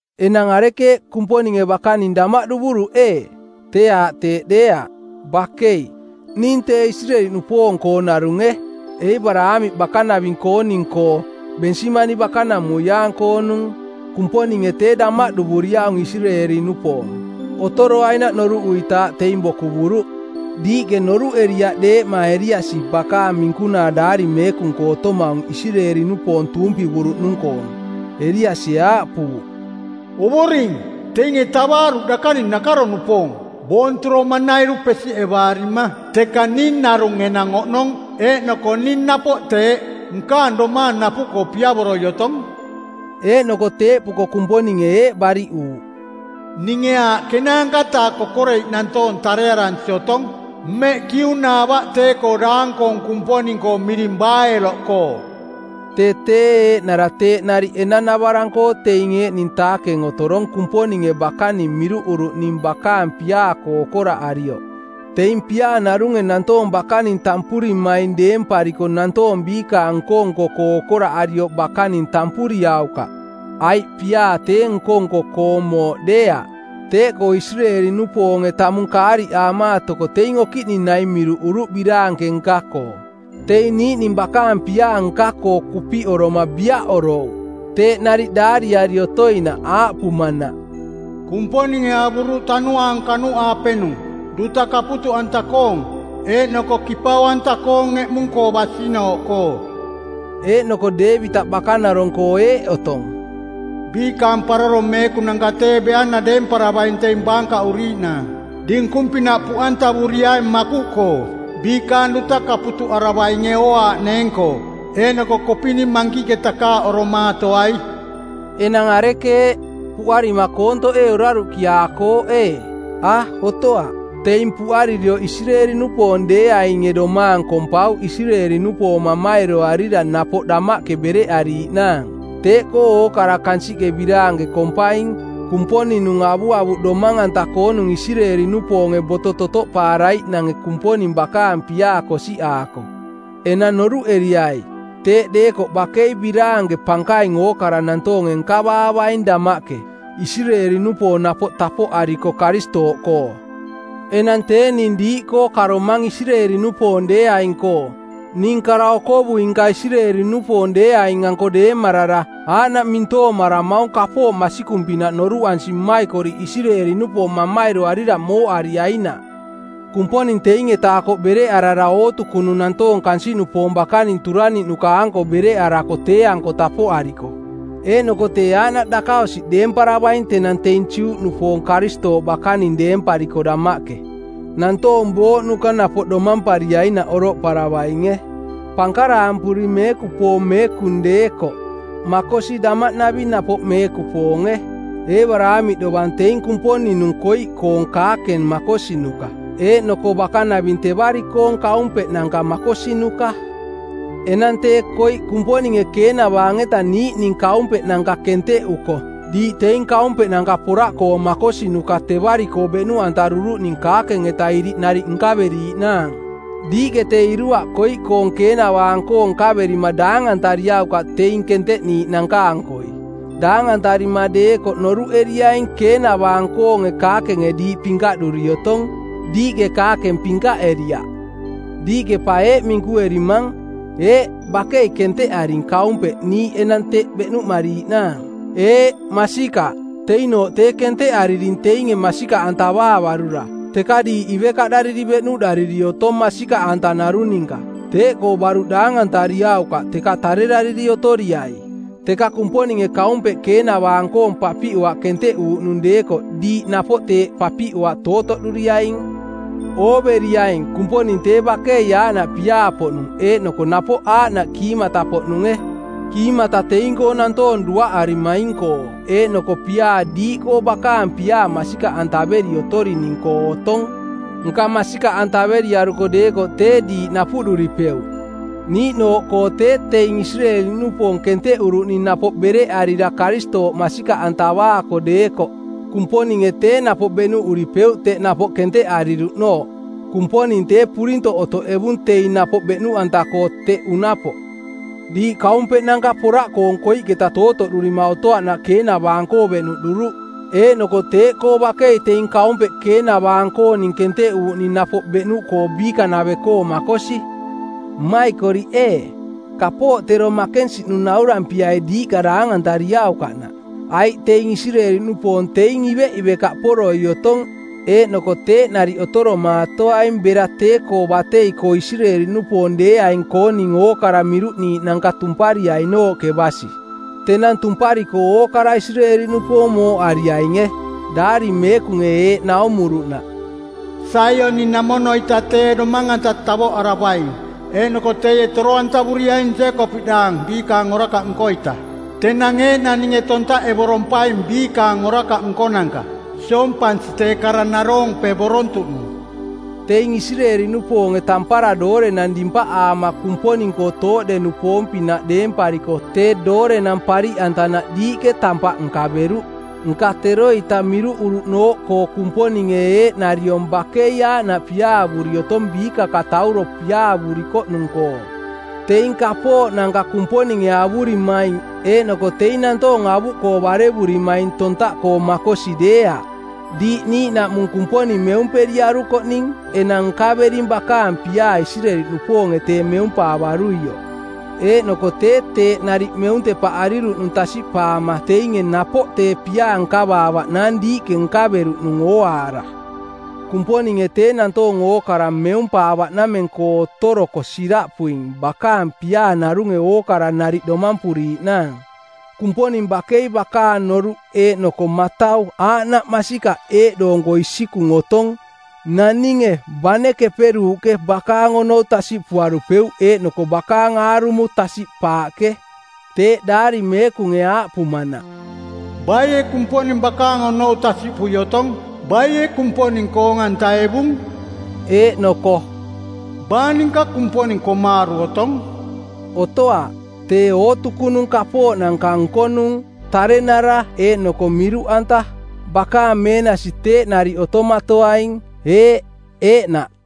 Enang arekeeꞌ, Kumponinge bakaning damaꞌduvuruꞌ ee? Tee aaꞌ teeꞌ deeaꞌ, bakei! Ning tee Isireeli-nupoong-koo narunge, Eebaraamiꞌ bakanaving-kooning-koo, Bensimani bakanamuiaang-koonung. Kumponinge tee damaꞌduvuriaung Isireeli-nupoong. Otoroainaꞌ noruꞌuritaaꞌ teing bokuvuruꞌ. Diiꞌke noruꞌeriaꞌ deeꞌma Eliasi bakaang minkunaa Daari Meekung-koo otomaung Isireeli-nupoong tuumpivuruꞌnung-koong? Eliasie aaꞌpuuꞌ, “‘Ovoring, teinge tavaaruꞌ dakaning nakaro-nupoong, boonturoma-nairu pesiꞌevaarima. Teka ning narung enang oꞌnong, eeꞌnoko ning napoꞌ teeꞌ, nkaang domaang napuꞌkoo piavoroi otong.” Eeꞌnoko teeꞌpuko Kumponinge eeꞌ bariꞌuuꞌ, “Ninge aaꞌ ˜kenaanka-taa kokoreiꞌ nantoong tarearansi otong mmeꞌ kiunaavaꞌ tee-koo daang-koong kumponing-koo miring Baaelo-koo.” Tee tee eeꞌnara teeꞌ nariꞌ enanavarang-koo teing eeꞌning taakeng otorong Kumponinge bakaning miruꞌuruꞌning bakaang piaa-koo okoraꞌarioꞌ. Teing piaa narunge nantoong bakaning tampurimaing dempariko nantoong biikaang nko-nko-koo okoraꞌarioꞌ bakaning tampuriaukaꞌ aiꞌ piaa tee nko-nko-koong mooꞌ deeaꞌ. Teeꞌkoo Isireeli-nupoonge tamung kaariꞌaamaatoko teing okiꞌning naing miruꞌuruꞌ biraanke nka-koo. Teing niiꞌning bakaang piaa nka-koo kupiꞌoroma biaꞌorouꞌ. Teeꞌ nariꞌ daariari otoinaꞌ, aaꞌpumanaꞌ, “Kumponinge avuruꞌ tanuaang kanuꞌaapenung, duta kaputuꞌanta-koong, eeꞌnoko kipau-anta-koong eꞌmung-koo basinooꞌkoo.” Eeꞌnoko Deevitaꞌ bakanarong-koo eeꞌ otong: “Biikaang paroro meekunanka tee beana deemparavaing teing baankaꞌuriiꞌnaang, dinkung-pinaꞌ puꞌantavuriaing makuꞌkoo. Biikaang duta kaputuꞌaravainge ooaaꞌneeng-koo, eeꞌnoko kopini mankiꞌke takaaꞌoromaatoai.” Enang arekeeꞌ, puꞌarima koontoꞌ ee oraruꞌkiaakooꞌ ee? A, otoaꞌ. Teing puꞌaririoꞌ Isireeli-nupoong deeainge domaang kompauꞌ Isireeli-nupoong mamairoarira napoꞌ damaꞌke bereꞌariiꞌnaang. Teeꞌkoo ookara kansiꞌke biraanke kompaing Kumponing-nung avuavuꞌ domang-anta-koonung Isireeli-nupoonge boto totoꞌpaaraiꞌnange Kumponing bakaang piaa kosiꞌaako. Enang noruꞌeriai, teeꞌ deekoꞌ bakei biraanke pankaing ookara nantoonge nkavaavaing damaꞌke, Isireeli-nupoong napoꞌ tapoꞌariko Karistooꞌkoo. Enang tee ning diiꞌkoo karomang Isireeli-nupoong deeaing-koo. Ning kara-okovui-nka Isireeli-nupoong deeaing-anko deemarara aaꞌnaꞌ mintoomaramaung kapooꞌ masikung-pinaꞌ noruꞌansi mmaikoriꞌ Isireeli-nupoong mamairoarira mooꞌariainaꞌ. Kumponing teing-eta akoꞌ bereꞌarara ootukunung nantoong kansiꞌnupoong bakaning turaniꞌnuka-anko bereꞌarako tee-anko tapoꞌariko. Eeꞌnoko tee aaꞌnaꞌ dakaosiꞌ deemparavaing tenang teing Juꞌnupoong Karistooꞌ bakaning deempariko damaꞌke, nantoong booꞌnuka napoꞌ domampariainaꞌ oroꞌparavainge. Pankaraampuri meekupoong meekung deekoꞌ makosi damaꞌnaving napoꞌ meekupoonge. Eebaraamiꞌ dovang teing Kumponing-nung koiꞌkoong kaakeng makosinuka eeꞌnoko bakanaving tevari-koong kaumpeꞌnanka makosinuka. Enang tee koiꞌ Kumponinge keenavaang-eta niiꞌning kaumpeꞌnanka kenteꞌuko diiꞌ teing kaumpeꞌnanka poraꞌkoong makosinuka tevari-koo beꞌnuꞌantaruruꞌning kaakeng-eta iriꞌ nariꞌ nkaveriiꞌnaang. Diiꞌke tee iruaꞌ koiꞌkoong keenavaang-koong nkaverima daangantariaukaꞌ teing kenteꞌniiꞌnanka-ankoi. Daangantarima deekoꞌ noruꞌeriaing keenavaang-koonge kaakenge diiꞌ pinkaꞌduri otong. Diiꞌke kaakeng pinkaꞌeriaꞌ. Diiꞌke pa eeꞌ minkuerimang: Eeꞌ, bakei kenteꞌaring kaumpeꞌ niiꞌ enang teꞌ beꞌnuꞌmariiꞌnaang. Eeꞌ, masikaꞌ. Teinooꞌ tee kenteꞌariring teinge masikaꞌantavaavarura. Teka diiꞌ ivekaꞌdariri beꞌnuꞌdariri otong masikaꞌanta narung ninka. Teeꞌkoo baruꞌ daangantariaukaꞌ teka tarerariri otoriai. Teka Kumponinge kaumpeꞌ keenavaang-koong papiꞌoaꞌ kenteꞌuuꞌnung deekoꞌ diiꞌ napoꞌ teeꞌ papiꞌoaꞌ tootoꞌduriaing. Ooveriaing Kumponing tee bakei aaꞌnaꞌ piaa-poꞌnung eeꞌnoko napoꞌ aaꞌnaꞌ kiimata-poꞌnunge. Kiimata teing-koo nantoong duaꞌarimaing-koo eeꞌnoko piaa diiꞌkoo bakaang piaa masikaꞌantaveri otorining-koo otong. Nka masikaꞌantaveriaruko deekoꞌ tee diiꞌ napuꞌduripeuꞌ. Niiꞌnooꞌkoo tee teing Isireeli-nupoong kenteꞌuruꞌning napoꞌ bereꞌarira Karistooꞌ masikaꞌantavaako deekoꞌ Kumponinge tee napoꞌ beꞌnuꞌuripeuꞌ teꞌ napoꞌ kenteꞌariruꞌnooꞌ. Kumponing tee purintoꞌ otoꞌevung teing napoꞌ beꞌnuꞌanta-koo teꞌ unapoꞌ. Diiꞌ kaumpeꞌnanka poraꞌkoong koiꞌketa tootoꞌdurima otoaꞌnaꞌ keenavaang-koo beꞌnuꞌduruꞌ, eeꞌnoko teeꞌkoo bakei teing kaumpeꞌ keenavaang-kooning kenteꞌuuꞌning napoꞌ beꞌnuꞌkoo biikanave-koo makosi. Mmaikoriꞌ ee, kapooꞌ tero makensiꞌnung naurampiai diiꞌka daangantariaukaꞌnaꞌ. Aiꞌ teing Isireeli-nupoong teing iveꞌivekaꞌporoi otong eeꞌnoko teeꞌ nariꞌ otoromaatoaing bera tee-koo batei-koo Isireeli-nupoong deeaing-kooning ookara miruꞌniiꞌnanka tumpariainooꞌke basi. Tenang tumpariko ookara Isireeli-nupoong mooꞌariainge, Daari Meekunge eeꞌ naumuruꞌnaꞌ, “Saioni-namono-ita tee Domang-anta tavoꞌaravaing eeꞌnoko teie toro-antavuriaing Jeekopiꞌdaang biikaang orakaꞌ nko-ita. Tenang eeꞌnang ninge tontaꞌevorompaing biikaang orakaꞌ nkonanka, siompansi tee kara naroompevorontuꞌnung.” Teing Isireeli-nupoonge tampara doorenang dimpaꞌaama Kumponing-koo tooꞌde-nupoong-pinaꞌ deempariko tee doorenang pariꞌantanaꞌ diiꞌke tampaꞌ nkaveruꞌ. Nka teroita miruꞌuruꞌnooꞌkoo Kumponinge eeꞌnariong bakei aaꞌnaꞌ piaavuri otong biikakatauro piaavurikoꞌnung-koo. Teing kapooꞌnanka Kumponinge avurimaing eeꞌnoko teing nantoong avuꞌkoo barevurimaing tontaꞌkoo makosi deeaꞌ. Diiꞌ niiꞌnaꞌmung Kumponing meumperiarukoꞌning enang nkavering bakaang piaa Isireeli-nupoonge tee meumpaavaruioꞌ. Eeꞌnoko tee teeꞌ nariꞌ meuntepaꞌariruꞌnung tasiꞌpaama teinge napoꞌ tee piaa nkavaavaꞌnaang diiꞌke nkaveruꞌnung ooaara. Kumponinge tee nantoong ookara meumpaavaꞌnameng-koo otoroko siraꞌpuing bakaang piaa narunge ookara nariꞌ domampuriiꞌnaang. Kumponing bakei bakaang noruꞌ eeꞌnoko matau aaꞌnaꞌ masikaꞌ eeꞌdoonko isikung otong. Naninge bane keperuuꞌke bakaang onou tasiꞌpuarupeuꞌ eeꞌnoko bakaang aarumo tasiꞌpaaꞌke. Teeꞌ Daari Meekunge aaꞌpumanaꞌ, “Baie Kumponing bakaang onou tasiꞌpui otong? Baie Kumponing koong-antaevung?” Eeꞌnoko “Baa ninka Kumponing komaaru˜ otong?” Otoaꞌ. Tee ootukunung kapooꞌnanka nkonung, tarenara eeꞌnoko miruꞌanta. Bakaang meenasi teeꞌ nariꞌ otomatoaing. Eeꞌ, eeꞌnaꞌ.